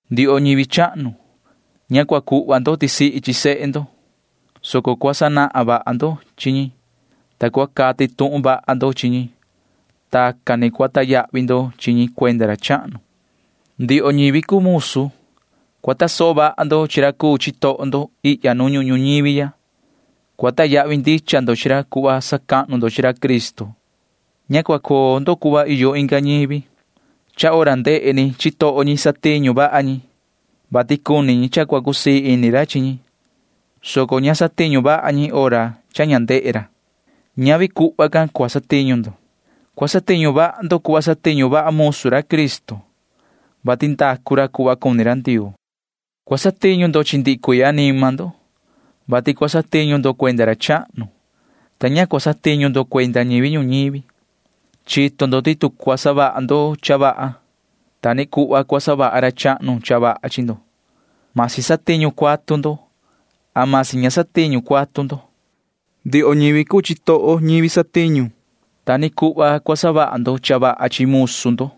Ndioho ñivi chahnu, ña cua cuhva ndo tisihi chi sehe ndo, soco cua sanahan vaha ndo chi ñi, ta cua cati tuhun vaha ndo chi ñi. Tacan ni cua sacuahnu ndo chi ñi cuenda ra chahnu. Ndioho ñivi cuu musu, cua tasoho vaha ndo chi ra cuu chitoho ndo ihya nu ñuhun ñuñivi ya. Cua sacahnu ndicha ndo chi ra cuhva sacahnu ndo chi ra Cristo. Ña cua coo ndo cuhva iyo inga ñivi. Satiñu vaha ñi hora ndehe chitoho ñi nu satiñu ñi, vati cuni ñi cha cua cusii ini ra chi ñi, soco ña satiñu vaha ñi hora cha ña ndehe ca ra. Ñavi tacan cua satiñu ndo, soco cua satiñu vaha ndo cuhva satiñu vaha musu ra Cristo, vati ndacu ra cuhva cuni ra Ndioo. Cua satiñu ndo chi ndihi cuii anima ndo, vati cua satiñu ndo cuenda ra chahnu, ta ña cua satiñu ndo cuenda ñivi ñuñivi. Chito ndo ti tu cua savaha ndo cha vaha, ta ni cuhva cua savaha ra chahnu cha vaha chi ndo―masi satiñu cuatu ndo, masi ña satiñu cuatu ndo. Ndioho ñivi cuu chitoho, ta ni cuhva cua savaha ndo cha vaha chi musu ndo.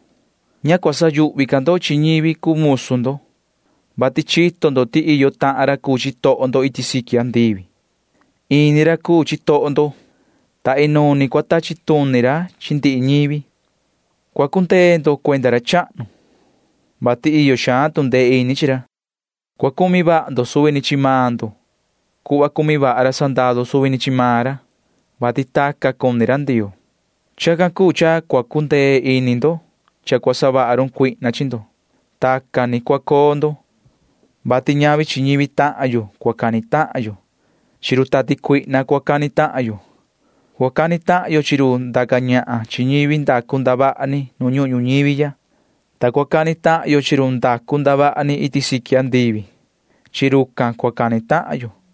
Ña cua sayuhvi ca ndo chi ñivi cuu musu ndo, vati chito ndo ti iyo tucu chitoho maan ndo iti siqui andivi. Ini ra cuu chitoho maan ñi, ta inuun ni cua tachi tuni ra chi ndihi ñivi. Cua cundee ndo cuenda ra chahnu, vati iyo xaan tu ndee ini chi ra. Cua cumi vaha ndo suvi ni chi maan ndo cuhva cumi vaha ra sandaru suvi ni chi maan ra, vati tacan ni cuni ra Ndioo. Chacan cuu cha cua cuu cundee ini ndo cha cua cuni savaha run cuihna chi ndo. Tacan ni cua coo ndo, vati ña cua cani tahan yo chi ñivi, soco cua cani tahan yo chi run tati cuihna. Cua cani tahan yo chi run ndaca ñahan chi ñivi ndacu ndavaha ni nu ñuhun ñuñivi ya, ta cua cani tahan yo chi run ndacu ndavaha ni iti siqui andivi. Chi rucan cua cani tahan yo.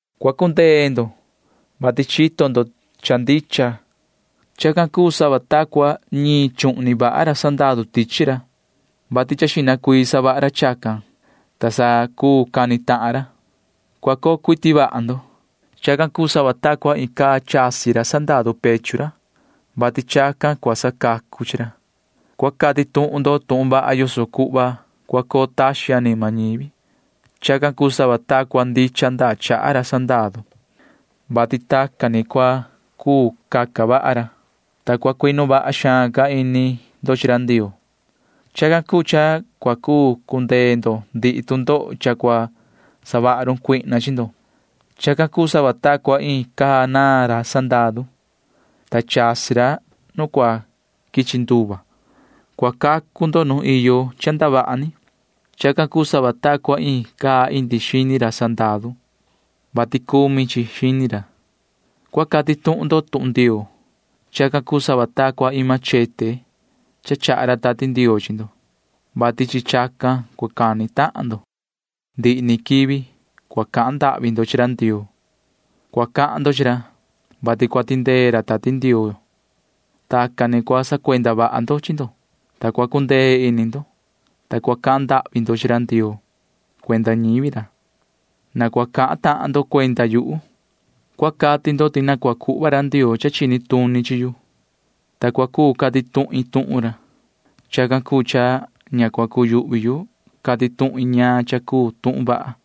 Cua cundee ndo, vati chito ndo cha ndicha. Chacan cuu sava ta cua ñiin chuhni vaha ra sandaru tichi ra, [vati cha xihna cuii savaha ra chacan, ta sa cua cuu cani tahan ra]. Cua coo cuiti vaha ndo. Chacan cuu sava ta cua iin caa chasi ra sandaru pechu ra, [vati chacan cua sacacu chi ra]. Cua cati tuhun ndo tuhun vaha yoso cuhva cua coo taxin anima ñivi. Chacan cuu sava ta cua ndichan ndaa chaha ra sandaru, [vati tacan ni cua cuu caca vaha ra]. Ta vii ca cua cuinu vaha xaan ini ndo chi ra Ndioo. Chacan cuu cha cua cuu cundee ndo ndihi tu ndoho cha cua savaha run cuihna chi ndo. Chacan cuu sava ta cua iin caa naan ra sandaru, ta chasi ra nu cua quichi nduva. Cua cacu ndo nu iyo cha ndavaha ni. Chacan cuu sava ta cua iin caa indi xini ra sandaru, [vati cumi chi xini ra]. Cua cati tuhun ndo tuhun Ndioo. Chacan cuu sava ta cua iin machete cha chaha ra Tati Ndioo chi ndo, [vati chi chacan cua cani tahan ndo]. Ndihi ni quivi cua cahan ndahvi ndo chi ra Ndioo. Cua cahan ndo chi ra, vati cua tindee ra Tati Ndioo. Tacan ni cua sacuenda vaha ndo chi ndo. Cua cundee vaha ini ndo, ta cua cahan ndahvi ndo chi ra Ndioo cuenda ñivi ra. Na cua cahan tahan ndo cuenda yuhu. Cua cati ndo ti na cua cuhva ra Ndioo cha chini tuni chi yu, ta cua cuu cati tuhin tuhun ra. Chacan cuu cha ña cua cuyuhvi yu cati tuhin ñaan cha cuu tuhun vaha ra.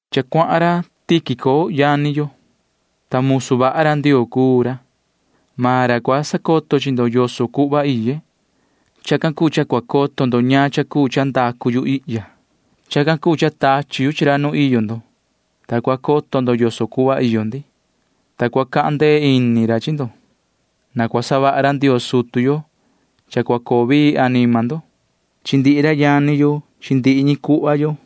Cha cuahan ra Tíquico yani yo, ta musu vaha ra Ndioo cuu ra. Maan ra cua sacoto chi ndo yoso cuhva iye. Chacan cuu cha cua coto ndo ñaan cha cuu cha ndacu yu ihya. Chacan cuu cha tachi yu chi ra nu iyo ndo, ta cua coto ndo yoso cuhva iyo ndi, ta cua cuhva ra tu ndee ini chi ndo. Na cua savaha ra Ndioo sutu yo cha cua coo vii anima ndo chi ndihi ra yani yo chi ndihi ñi cuhva yo.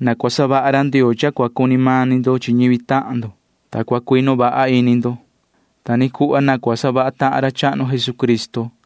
Na cua savaha ra Ndioo cha cua cuni mani ndo chi ñivi tahan ndo, ta cua cuinu vaha ini ndo. Ta ni cuhva na cua savaha tahan ra chahnu Jesucristo.